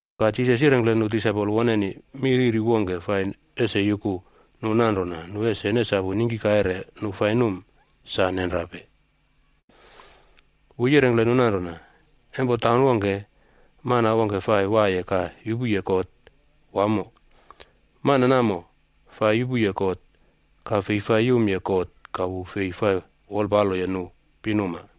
Ka Jisas yirengkle nu disaipol woneni mi riri wongke fai ese yuku nu nanrona nu ese nesapu ningki kaire nu fai num, sa nenrape. Wu yirengkle nu nanrona, “Empo taun wongke, mana wongke fai waiye ka yupuye kot wamo. Mana namo fai yupuye kot ka fei fai yumye God ka wu fei fai wolpaloye nu pinuma.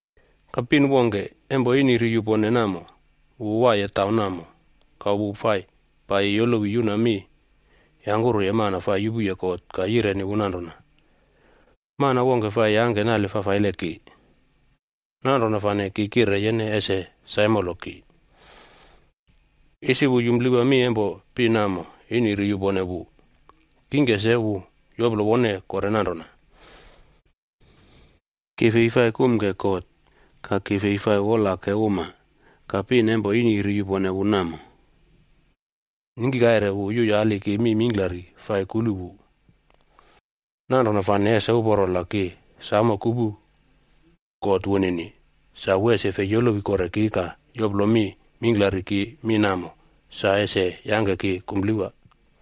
Ka pin wongke, empo ini ri yupone namo, wu waiye taun namo, ka wu fai paiyi yolowi yuna mi yangkuruye mana fai yupuye kot ka yireni wu nanrona, ‘Mana wongke fai yangke nale fafaile ki, nanrona fane ki kire yene ese saimolo ki.’ “Isi wu yumplewa mi empo pin namo ini ri yupone wu. Kingke se wu yoplo wone kore nanrona, ‘Ki fei fai kumke God, ka ki fei fai wolake uma. Ka pin empo ini ri yupone wu namo, ningki kaire wu yuyali ki mi mingklari fai kulu wu. Nanrona fane, ese uporo la ki samo kupu kot wunini, sa wu ese fei yolowi kore ki ka yoplo mi mingklari ki mi namo sa ese yangke ki kumplewa.’”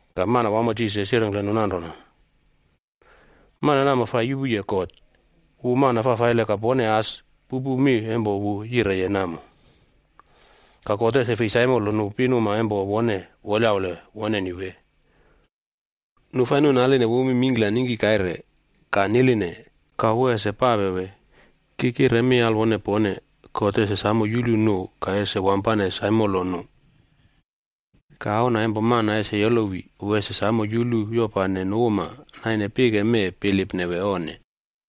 Ka Manawamo Jisas yirengkle nu nanrona, “Mana namo fa yupuye kot, wu mana fafaile ka pone as pupu mi empo wu yireye namo. Ka God ese fei saimolo nu pinuma empo wone yaule woneni wee? Nu fa nuꞌnaline wu mi mingkla ningki kaire ka niline, ka wu ese pape wee? Ki kire mi alwone pone, God ese samo yulu nu ka ese wampane saimolo nu. Ka, Auna empo Mana ese yolowi, wu ese samo yulu yopane nu uma naine pike mee bilipne wee onne?”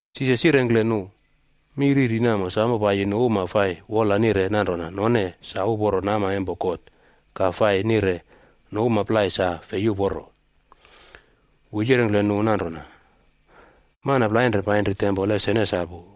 Jisas yirengkle nu mi riri namo samo paiyi nu uma fai wola nire nanrona none sa uporo nama empo God ka fai nire nu uma plai sa fei uporo. Wu yirengkle nu nanrona, “Mana plainre painri tempol ese nesapu.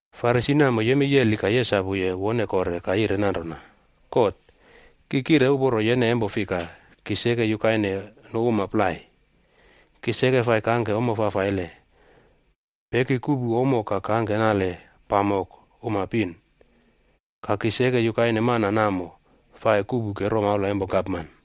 Farisi namo yemei yeli ka yesapuye wone kore ka yire nanrona, ‘God, ki kire uporo yene empo fika, ki seke yukaine nu uma plai. Ki seke fai kangke ommo fafaile, peki kuꞌpu ommo ka kangke nale pamok uma pin. Ka ki seke yukaine mana namo fai kuꞌpuke romaula empo gapman.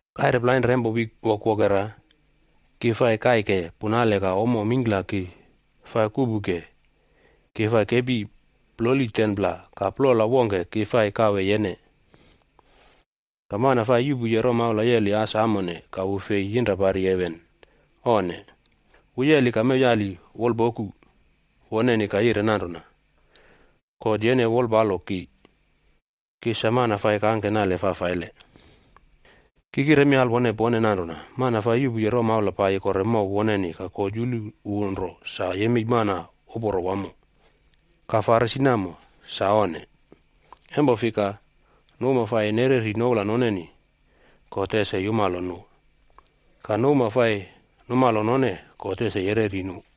Kaire plainre empo wik wokwokera ki fai kaike punale ka ommo mingkla ki fa kuꞌpuke, ki fai kepi ploli 10pla ka plola wongke ki fai kawe yene.’ “Ka mana fai yuꞌpuye romaula yeli as amone ka wu fei yinrapari heven, onne! Wu yeli ka mew yali wol pokub woneni ka yire nanrona, ‘God yene wolpalo ki. Ki sa mana fai kangke nale fafaile.’ “Ki kire mi alwone pone nanrona, mana fai yuꞌpuye romaula paiyi kore mow woneni ka God yulu wu nro sa yemei mana uporo wamo. Ka Farisi namo, sa onne. Empo fika, nu uma fai nereri noula noneni, God ese yumalo nu, ka nu uma fai numalo none, God ese yereri nu.”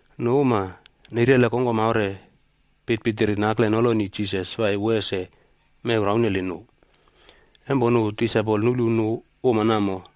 Nu uma neirele kongkom aure pitpitiri nakle noloni Jisas fai wu ese mew rauneli nu. Empo nu disaipol nulu nu uma namo,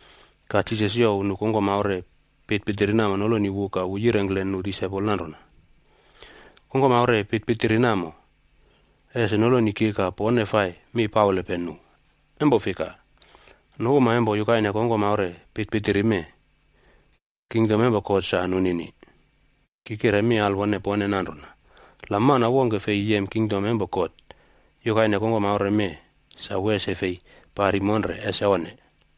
Ka Jisas youw nu kongkom aure pitpitiri namo noloni wu ka wu yirengkle nu disaipol nanrona, “Kongkom aure pitpitiri namo ese noloni ki ka pone fai mi paulepe nu. Empo fika, nu uma empo yukaine kongkom aure pitpitiri mee, kingdom empo God sa nunini. Ki kire mi alwone pone nanrona, la mana wongke fei yem kingdom empo God yukaine kongkom aure mee, sa wu ese fei pari monre, ese onne.”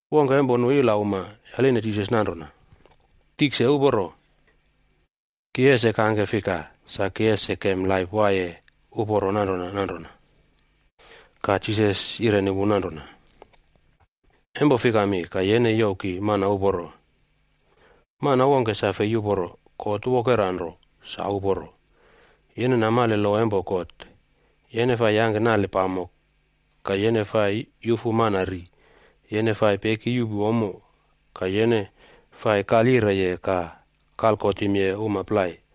Wongke empo nu ilauma yaline Jisas nanrona, “Tikse uporo, ki ese kangke fika sa ki ese kem laip waiye uporo nanrona nanrona?” Ka Jisas yireni wu nanrona, “Empo fikami, ka yene youw ki mana uporo? Mana wongke sa fei uporo. God wokera nro sa uporo. Yene namale lo empo God: Yene fai yangke nale pamok, ka yene fai yufu mana ri, yene fai peki yuꞌpu ommo, ka yene fai kalyireye ka kalkotimye uma plai,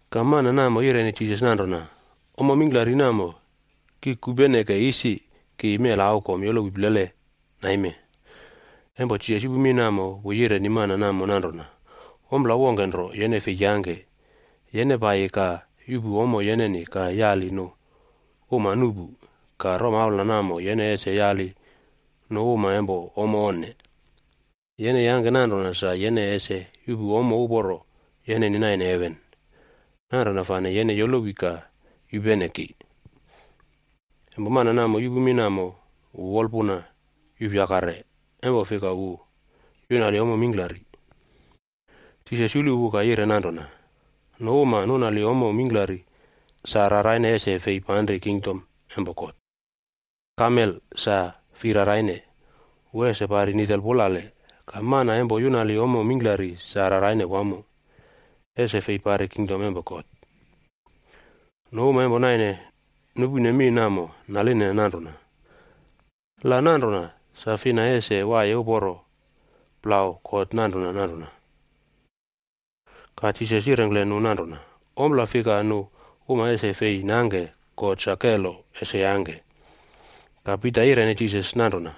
Ka mana namo yireni Jisas nanrona, “Ommo mingklari namo ki kupeneke isi ki mela aukom yolowi plele naime.” Empo Jisas yupu mi namo, wu yireni mana namo nanrona, “Ompla wongke nro yene fei yangke. Yene paiyi ka yuꞌpu ommo yeneni ka yali nu uma nuꞌpu, ka romaula namo yene ese yali nu uma empo ommo onne. Yene yangke nanrona sa yene ese yuꞌpu ommo uporo yeneni naine heven. Nanrona fane yene yolowi ka yupene ki.” Empo mana namo yupu mi namo, wu wolpuna yuꞌpyakare. Empo fika wu yunali ommo mingklari. Jisas yulu wu ka yire nanrona, “Nu uma nunali ommo mingklari, sa raraine ese fei panri kingdom empo God. Kamele sa fei raraine, wu ese pari nitel pulale, ka mana empo yunali ommo mingklari sa raraine wamo, ese fei pari kingdom empo God.” Nu uma empo naine nupune mi namo naline nanrona, “La nanrona, sa fina ese waiye uporo plau God nanrona nanrona?” Ka Jisas yirengkle nu nanrona, “Ompla fika nu uma ese fei nangke, God sa kelo ese yangke.” Ka Pita yireni Jisas nanrona,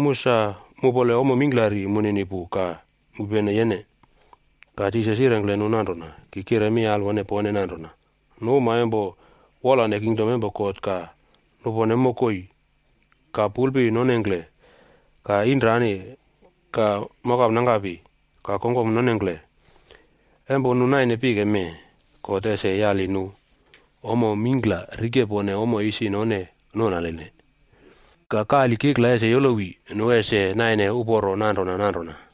“Mu sa mupole ommo mingklari munini pu ka mupene yene.” Ka Jisas yirengkle nu nanrona, “Ki kire mi alwone pone nanrona, nu uma empo wolane kingdom empo God ka nupone mokoi, ka pulpi nonengkle, ka inrani, ka mokapnangkapi ka kongkom nonengkle, empo nu naine pike mee, God ese yali nu ommo mingkla rikepone ommo isi none nunaline. Ka kali kikla ese yolowi, nu ese naine uporo nanrona nanrona.”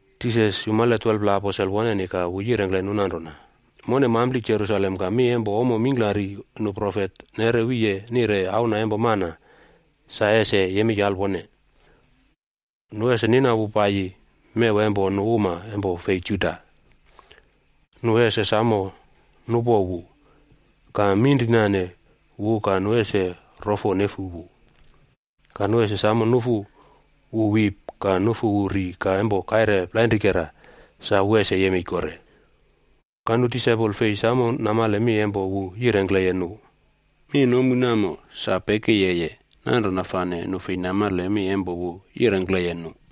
Jisas yumale 12pla aposel woneni ka wu yirengkle nu nanrona, “Mone mampli Jerusalem ka mi empo ommo mingklari nu profet neꞌre wiye nire Auna empo Mana sa ese yemei alwone. Nu ese nina wu paiyi mew empo nu uma empo fei Juda.f Nu ese samo nupo wu, ka minrinane wu ka nu ese rofo nefu wu. Ka nu ese samo nufu wu wip ka nufu wu ri ka empo kaire plainrikera, sa wu ese yemei kore.” Ka nu disaipol fei samo namale mi empo wu yirengkleye nu. Mi nomu namo sa pekiyeye, nanrona fane nu fei namale mi empo wu yirengkleye nu.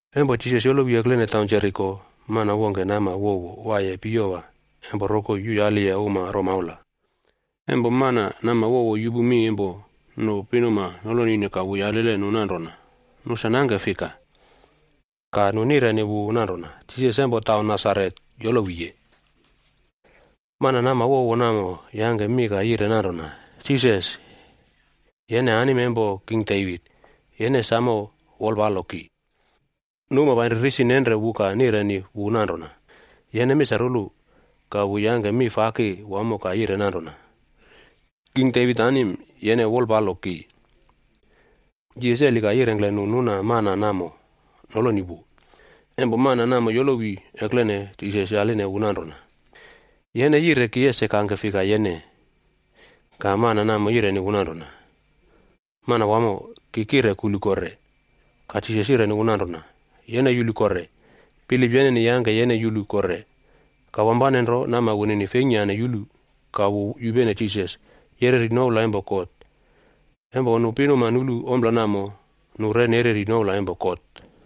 Empo Jisas yolowi eklene taun Jeriko, mana wongke nama wowo waiye piyowa empo rokoi yuyaliye uma romaula. Empo mana nama wowo yupu mi empo nu pinuma nolonine ka wu yalile nu nanrona, nu sa nangke fika. Ka nu nireni wu nanrona, “Jisas empo Nasaret yolowiye.” Mana nama wowo namo yangke mi ka yire nanrona, “Jisas, yene anim empo King Devit,g yene samo wolpalo ki.” Nu uma painri risi nenre wu ka nireni wu nanrona, “Yene misarulu.” Ka wu yangke mi faki wamo ka yire nanrona, “King Devit anim, yene wolpalo ki.” Jisas yeli ka yirengkle nu nuna mana namo noloni wu. Empo mana namo yolowi eklene, Jisas yaline wu nanrona, “Yene yire ki ese kangke fika yene?” Ka mana namo yireni wu nanrona, “Manawamo, ki kire kulu kore.” Ka Jisas yireni wu nanrona, “Yene yulu kore. Bilip yeneni yangke yene yulu kore.” Ka wampane nro nama wunini feingkyane yulu, ka wu yupene Jisas, yereri noula empo God. Empo nu pinuma nulu ompla namo, nu re nereri noula empo God.